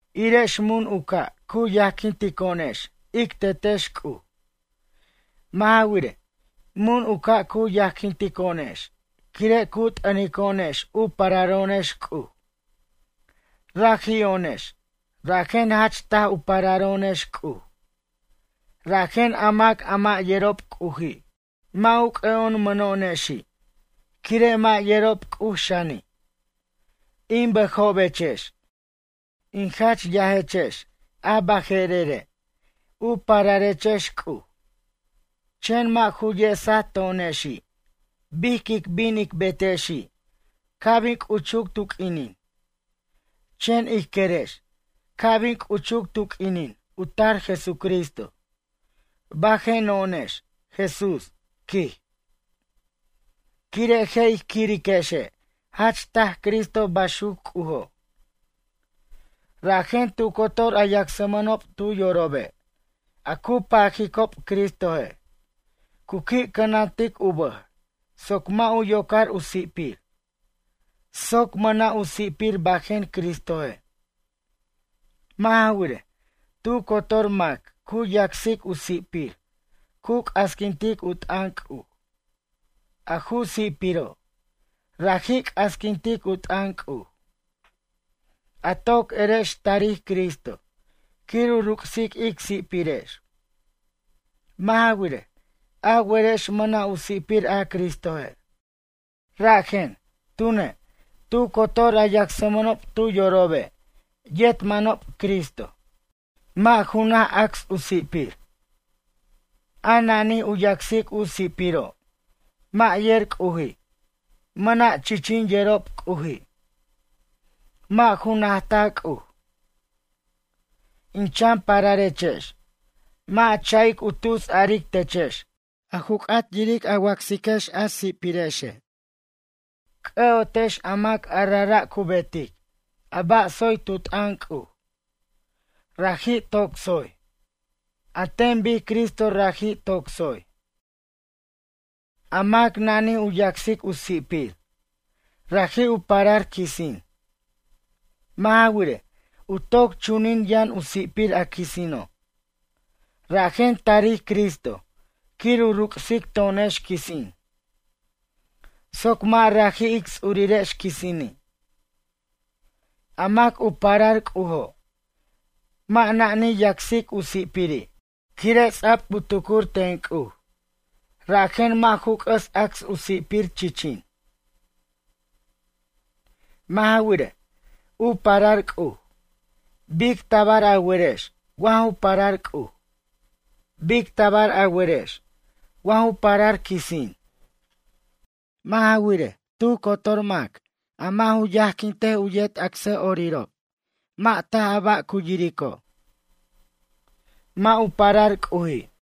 Irex mun u ca' cu yajquintico'onex ic Tetex C'uj. Mʌ' ja wirej, mun u ca' cu yajquintico'onex quire' cu t'ʌnico'onex u pararo'onex C'uj. Raji'o'onex, rajen jach taj u pararo'onex C'uj. Rajen a mac a mʌ' yerob C'uji' mʌ' u c'ʌ'omʌno'onexi' quire' mʌ' yerob C'uj xani'. In bʌjobechex, in jach yajechex a baje'rere' u pararechex C'uj. Chen mʌ' ju yesaj to'onexi' bic quic bin ic betexi' ca' bin c'uchuc tu q'uinin. Chen ij querex ca' bin c'uchuc tu q'uinin u tar Jesucristo bajeno'onex Jesús, quij. Quire' je' ij quiriquexe' jach taj Cristo baxuc C'ujo'. Rajen tu cotor a yacsmʌnob tu yorobe' a cu pajicob Cristoje'. Cu qui' cʌnantic u bʌj soc mʌ' u yocar u si'pir, soc mʌna' u si'pir bajen Cristoje'. Mʌ' ja wirej, tu cotor mac cu yacsic u si'pir cu c'asquintic u t'ʌn C'uj. A ju si'piro', raji' c'asquintic u t'ʌn C'uj. A toc erex tarij Cristo quir u ruc'sic ic si'pirex. Mʌ' ja wirej, a werex mʌna' u si'pir a Cristoje'. Rajen, tune', tu cotor a yacsmʌnob tu yorobe' yet manob Cristoj. Mʌ' ju naj acs u si'pir. A najij u yacsic u si'piro', mʌ' yer C'uji', mʌna' chichin yerob C'uji'. Mʌ' ju najta C'uj. In chan pararechex, mʌ' a cha'ic u tus aric techex a ju c'at yiric a wacsiquechex a si'pirexe'. C'ʌ'otex a mac a rajra' cu betic a ba' tsoy tu t'ʌn C'uj, raji' toc tsoy, an ten bic Cristo raji' toc tsoy. A mac nani' u yacsic u si'pir, raji' u parar quisin. Mʌ' ja wirej, u toc chunin yʌn u si'pir a quisino'. Rajen tarij Cristo quir u ruc'sic to'onex quisin, soc mʌ' raji' ic ts'urirex quisini'. A mac u parar C'ujo' mʌ' nani yacsic u si'piri', quire' ts'a'b u cuxtar ten C'uj. Rajen mʌ' ju c'ʌs acs u si'pir, chichin. Mʌ' ja wirej, u parar C'uj. Bic tabar a werex wa ju parar C'uj? Bic tabar a werex wa ju parar quisin? Mʌ' ja wirej, tu cotor mac, a mʌ' u yajquint u yet acsʌ'orirob, mʌ' taj a ba' cu yirico'. Mʌ' u parar C'uji'.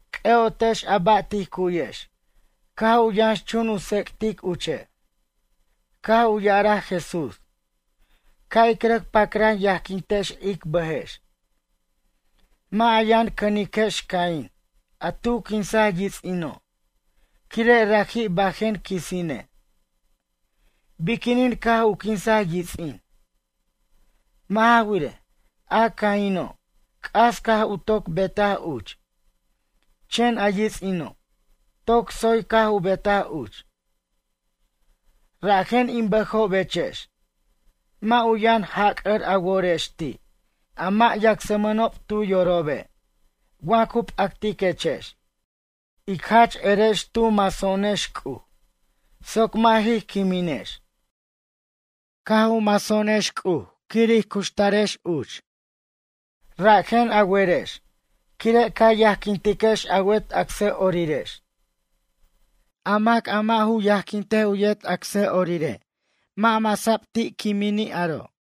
C'ʌ'otex a ba' tij cu'yex caj u yʌnxchun u tsec'tic uche'. Caj u ya'araj Jesús: “Ca' ic rʌc pacran yajquintex ic bʌjex.” Mʌ' a yʌn cʌniquex Caín a tu quinsaj yits'ino' quire' raji' bajen quisine'. Biquinin caj u quinsaj yits'in? Mʌ' ja wirej, a Caino', c'as caj u toc betaj uch, chen a yits'ino', toc tsoy caj u betaj uch. Rajen in bʌjobechex mʌ' u yʌn jac'ʌr a worex ti' a mʌ' yacsmʌnob tu yorobe' wa cu p'actiquechex. Ic jach erex tu maso'onex C'uj soc mʌ' jij quiminex. Caj maso'onex C'uj quir ij cuxtarex uch. Rajen a werex quire' ca yajquintiquex a wet acsʌ'orirex. A mac a mʌ' ju yajquint u yet acsʌ'orire' mʌ' masa'b ti' quimini' aro'.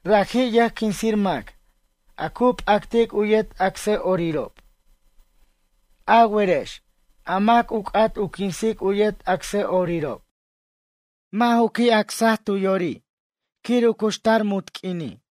Raji' yʌjquinsir mac a cu p'actic u yet acsʌ'orirob. A werex, a mac u c'at u quinsic u yet acsʌ'orirob, mʌ' ju qui' acsa tu yori' quir u cuxtar munt q'uini'.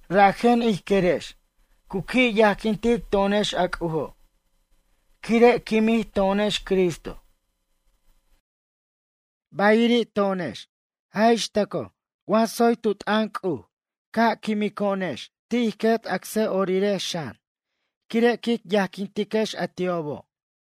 Rajen ij querex cu qui' yajquintic to'onex a C'ujo', quire' quimij to'onex Cristo. Bayiri' to'onex, jaj ix tʌco wa tsoy tu t'ʌn C'uj, caj quimico'onex ti' ij quet acsʌ'orirex xan quire' quic yajquintiquex a ti'obo'.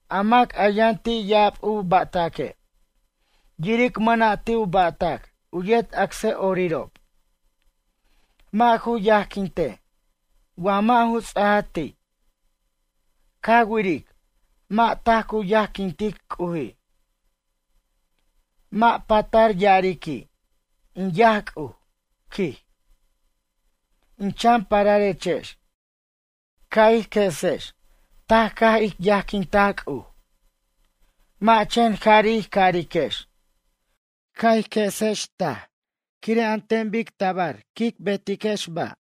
A mac a yʌn ti' ya'ab u ba'taque', yiric mʌna' ti' u ba'tac u yet acsʌ'orirob. Mʌ' ju yajquintej wa mʌ' ju ts'aja ti'. Ca wiric, mʌ' taj cu yajquintic C'uji'. Mʌ' patar ya'ariqui': “In yaj C'uj”, quij. In chan pararechex, ca' ij quesex taj caj ic yajquintaj C'uj. Mʌ' chen jari' ij cariquex. Ca' ij quesex taj quire' an ten bic tabar quic betex ba'.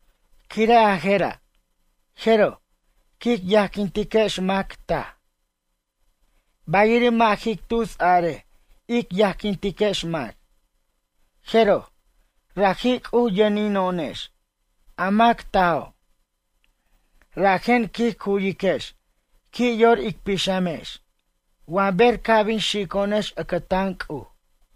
Quire' a je'ra', jeroj, quic yajquintiquex mac taj. Bayiri' mʌ' jic tus arej ic yajquintiquex mac. Jeroj, raji' C'uj yʌnino'onex, a mac tajo'. Rajen quij cu'yiquex qui' yor ic pixamex wa ber ca' bin xico'onex ʌcʌtan C'uj.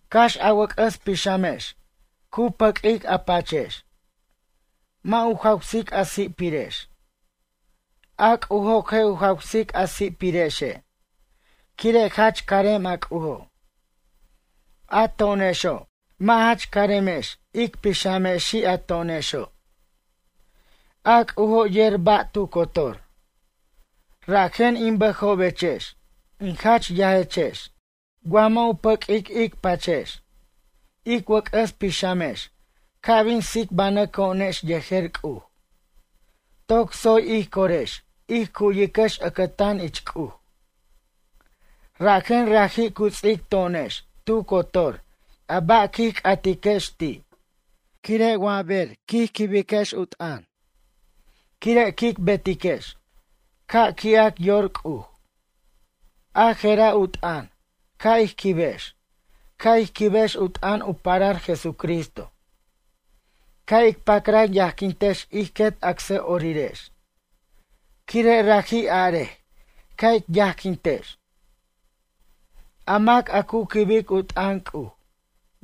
Cax a wʌc'ʌs pixamex cu pʌq'uic a pachex: “Mʌ' u jawsic a si'pirex”, a C'ujo' je' u jawsic a si'pirexe' quire' jach carem a C'ujo'. A to'onexo', mʌ' jach caremex ic pixamexi' a to'onexo'. A C'ujo' yer ba' tu cotor. Rajen in bʌjobechex in jach yajechex wa mʌ' u pʌq'uic ic pachex, ic wʌc'ʌs pixamex ca' bin tsicbanʌco'onex yejer C'uj, toc tsoy ij corex ij cu'yiquex ʌcʌtan ich C'uj. Rajen raji' cu ts'ic to'onex tu cotor a ba' quij c'atiquex ti', quire' wa bej quij quibex u t'ʌn, quire' quic betiquex ca' qui'ac yor C'uj. A je'ra' u t'ʌn ca' ij quibex, ca' ij quibex u t'ʌn u parar Jesucristo. Ca' ic pacran yajquintex ij quet acsʌ'orirex quire' raji' arej ca' ic yajquintex. A mac a cu quibic u t'ʌn C'uj,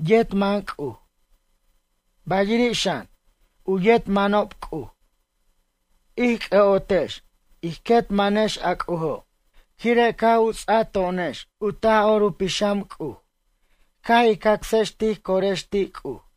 yet man C'uj. Bayiri' xan, u yet manob C'uj. Ij c'ʌ'otex ij quet manex a C'ujo' quire' caj u ts'a to'onex u Taj'or u Pixam C'uj caj ij cacsex tij corex ti' C'uj.